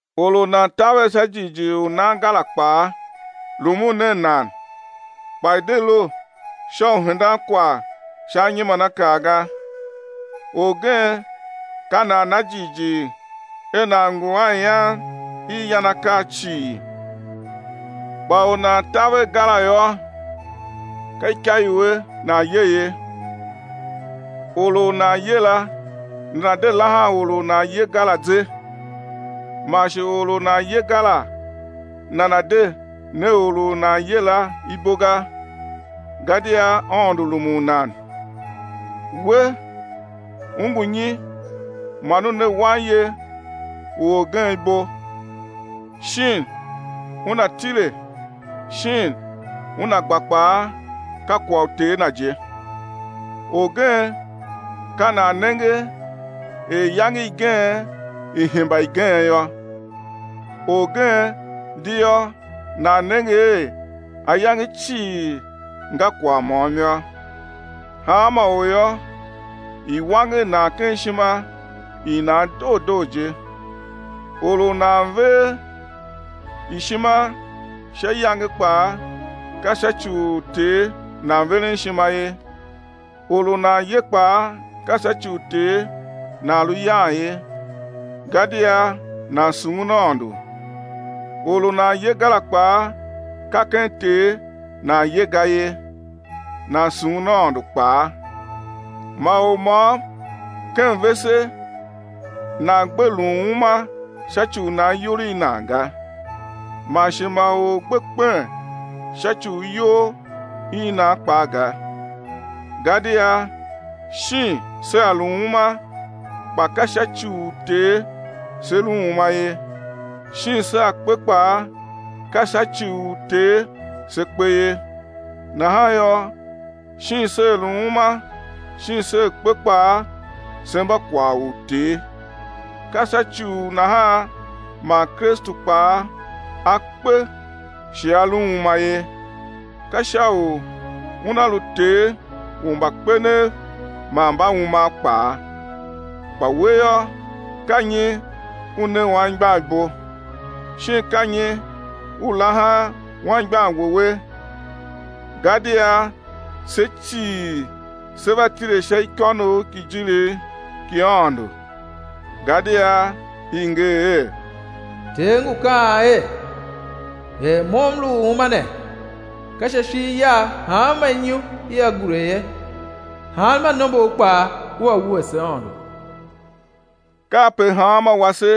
Or u nan taver sha jighjigh u nan ga la kpaa, rumun nen nan, kpa i̱ de lu sha u hendan kwagh sha anyimanakaa ga. Orgen ka nan na jighjigh er nan ngu a ian i yan akaa cii, kpa u nan taver ga la yô, ka ikaiue nan ye ye. Or u nan ye la nana̱ de lahan or u nan ye ga la ze, man shi or u nan ye ga la nana̱ de ne or u nan ye la ibo ga, gadia Aôndo rumun nan. We, u ngu nyi man u ne wanye u orgen ibo? Shin una tile, shin una gba kpaa ka kwagh u Ter na je. Orgen ka nan nenge er iyange igen i hemba igen yô. Orgen di yô nan nenge er ayange cii nga kwagh môm yô. Hanma or yô, i̱ wanger nan ken ishima i nan doo doo je. Or u nan ver ishima sha iyange kpaa ka sha ci u Ter nan veren ishima ye, or u nan ye kpaa ka sha ci u Ter nan lu yan ye, gadia nan sughun Aôndo. Or u nan ye ga la kpaa, ka ken Ter nan ye ga ye, nan sughun Aôndo kpaa. Ma or môm ken vese nan gbe lun uma sha ci u nan iyol i nan ga, man shi ma or gbe kpen sha ci u iyol i nan kpaa ga. Gadia shin sea lu uma, kpa ka sha ci u Ter se lu uma ye, shin sea kpe kpaa, ka sha ci u Ter se kpe ye, nahan yô, shin sea lu uma shin sea kpe kpaa se mba kwagh u Ter. Ka sha ci u nahan man Kristu kpaa A kpe shi A lu uma ye, ka sha u Una lu Ter u mbakpenev man mbaumav kpaa. Kpa we yô, ka nyi u ne anmgbian ibo? Shin ka nyi u laha anmgbian wouwe? Gadia se cii sé va tile sha ikônough ki ijirigh ki Aôndo. Gadia i nger er: Ter ngu kaan er: Er Mo M lu u uma ne, ka sha ishigh Yagh hanma inyu ia gure ye, hanma nombor kpaa ua wuese Aôndo. Kape hanmô wase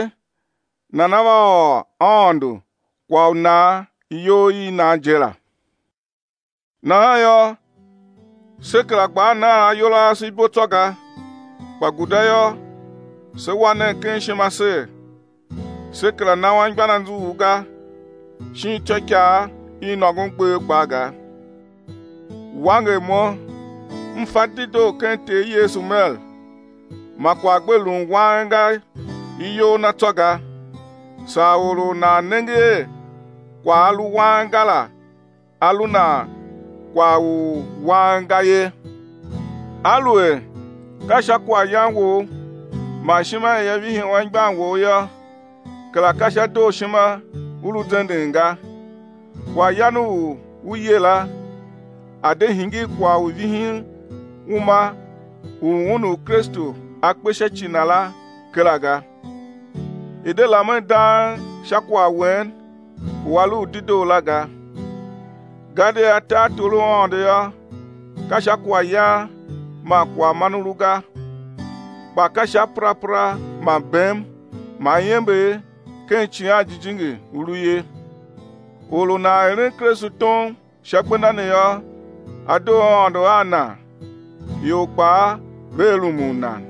nana va ôr [Aôndo] kwagh u nan iyol i nan je la. Nahan yô, se kera gbaa nan ayol ase ibo tsô ga, kpa guda yô, se wa nen ken ishima ser, sé kera na anmgbian anzughul ga shin ityôikaa i nôngon gbev kpaa ga. Wanger mo, m fa dedoo ken Ter Yesu mer, ma kwagh gbe lun wang ga iyol na tsô ga, saa or u nan nenge er kwagh a lu wang ga la a lu nan kwagh u wang ga ye. Aluer ka sha kwaghyan wou man ishima ia vihi anmgbian wou yô, kera ka sha dooshima u lu zenden ga. Kwaghyan u u ye la, a̱ de hingir kwagh u vihin uma u un u Kristu A kpe sha ci na la kera ga. I̱ de lamen dang sha kwagh wen u a lu u dedoo la ga. Gadia tartor u Aôndo yô, ka sha kwaghyan man kwaghman u lu ga, kpa ka sha perapera man bem man iember ken Icighan Jijingi u lu ye. Or u nan eren Kristu tom sha gbenda ne yô, á doo Aôndo a nan, ior kpaa vea rumun nan.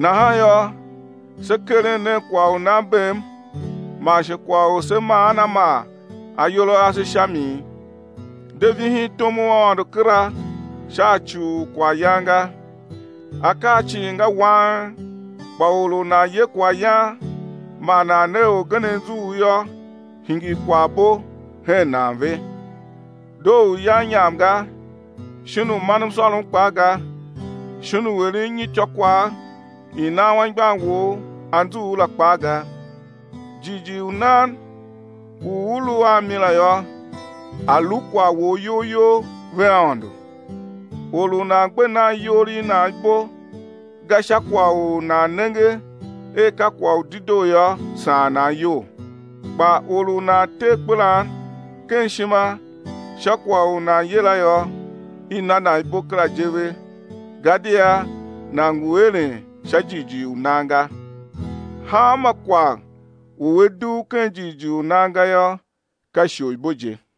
Nahan yô, se keren nen kwagh u nan bem man shi kwagh u se maan a maa ayol a ase sha mi. De vihin tom u Aôndo kera sha ci u kwaghyan ga. Akaa cii nga wang, kpa or u nan ye kwaghyan man nan ne orgen anzughul yô, hingir kwaghbo hen nan ve. Doo u yan inyam ga, shin u man msôrom kpaa ga, shin u eren nyityô kwagh i nan anmgbian wou anzughul la kpaa ga. Jighjigh u nan u u lu a mi la yô, a̱ lu kwagh wou iyol you vea Aôndo. Or u nan gbe nan iyol i nan ibo ga sha kwagh u nan nenge er ka kwagh u dedoo yô, saan nan iyol. Kpa or u nan te akpelan ken ishima sha kwagh u nan ye la yô, i na nan ibo kera je ve gadia nan ngu eren sha jighjigh u nan ga. Hanma kwagh u a dugh ken jighjigh u nan ga yô, ka isholibo je.